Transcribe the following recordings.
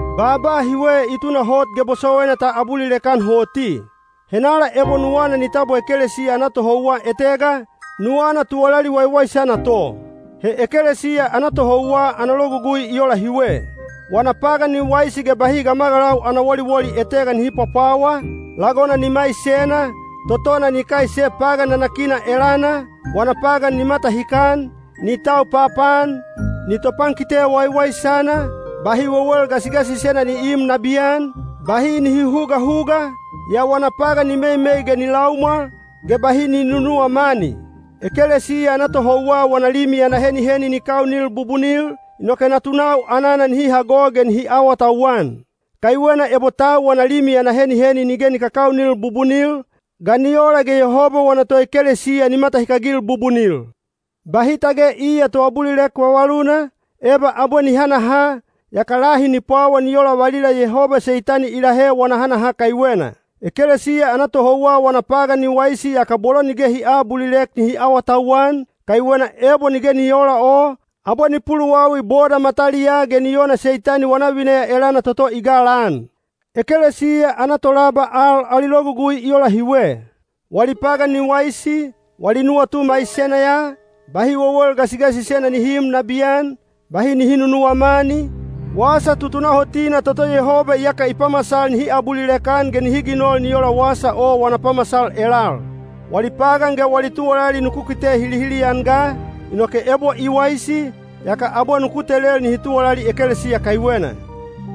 Baaba hiwe i tunahot ge bosowaina ta abulilek-an hoti: “Henala ebo nuwana ni tabwa ekelesiya ana tohouwa etega, nuwana tuwalali waiwaisana to.” He ekelesiya ana tohouwa ana logugui i ola hiwe: wana pagan ni waisi ge bahi gamagalau ana woliwoli etega nihi pwapwawa, lagona ni maisena, totona ni kaise pagan nanakina elana, wana pagan ni matahikan, ni tau papaan, ni topankite waiwaisana, bahi wewel gasigasisena ni iim nabiyan, bahi ni huhugahuga, yaa wana pagan ni meimei ge ni laumwal, ge bahi ni nunuwa mani. Ekelesiya ana tohouwa wana limi ana heniheni ni kaunil bubunil, inoke natunau anana nihi hago ge nihi awatauwan. Kaiwena ebo tau wana limi ana heniheni nige ni kakaunil bubunil, ga ni ola ge Yehoba wana toekelesiya ni matahikagil bubunil? Bahi tage iya toabulilek vavaluna, eba abwe ni hanaha, yaka lahi ni pwawa ni ola valila Yehoba Seitani i lahe wana hanaha kaiwena. Ekelesiya ana tohouwa wana pagan ni waisi yaka bolo nige hi aabulilek nihi awatauwan, kaiwena ebo nige ni oola o, abwe ni puluwawi boda mataliyaa ge ni ona Seitani wana vineya elana toto i galaan. Ekelesiya ana tolaba al ali logugui i ola hiwe: wali pagan ni waisi, wali nuwatu maisena ya, bahi wewel gasigasisena nihi iim nabiyan, bahi nihi nunuwa mani, wasa tutunahotina toto Yehoba iyaka i pamasal nihi abulilek-an ge nihi ginol ni ola wasa o wana pamasal elal. Wali pagan ge wali tuwalali nuku kite hilihili-an ga, inoke ebo i waisi, yaka abwe nuku telel nihi tuwalali ekelesiya kaiwena.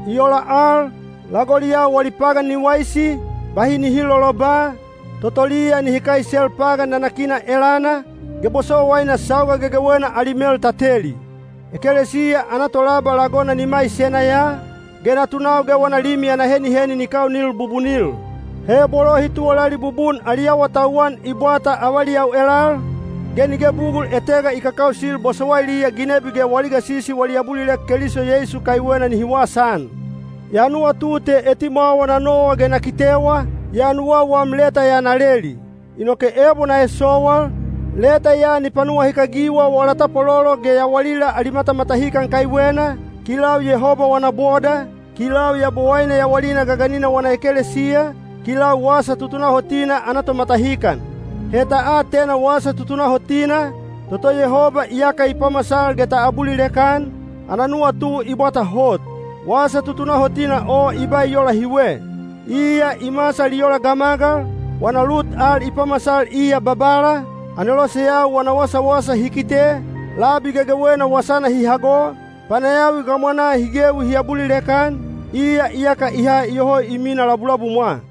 I ola al, lagoliyau wali pagan ni waisi, bahi nihi loloba, totoliya nihi kaisel pagan nanakina elana, ge bosowaina sauga gegewena ali mel ta teli. Ekelesiya ana tolaba lagona ni maisena ya, ge natunau ge wana limi ana heniheni ni kaunil bubunil. He bolo hi tuwalali bubun ali awatauwan i bwata avaliyau elal, ge nige bugul etega i kakausil bosowailiya ginebi ge wali gasisi wali abulilek Keliso Yeisu kaiwena nihi wasaan. Ya nuwatu te etimwawa na nowa ge na kitewa, yaa nuwau wam leta ya na leli. Inoke ebo na esowal, leta ya ni panuwahikagiwa wala tapwalolo ge yawalila ali matamatahikan kaiwena, kilau Yehoba wana boda, kilau Yabowaine yawalina gaganina wana ekelesiya, kilau wasa tutunahotina ana tomatahikan. He ta atena wasa tutunahotina, toto Yehoba iyaka i pamasal ge ta abulilek-an, ana nuwatu i bwata hot. Wasa tutunahotina o i ba i ola hiwe: Iya i masal i ola gamagal, wana lut al i pamasal iya Babala, aneloseyau hi kite, labi gegewena wasana hi hago, panayawi gamwanaa hi gewi hi abulilek-an, iya iyaka i ha iyoho i mina labulabumwa.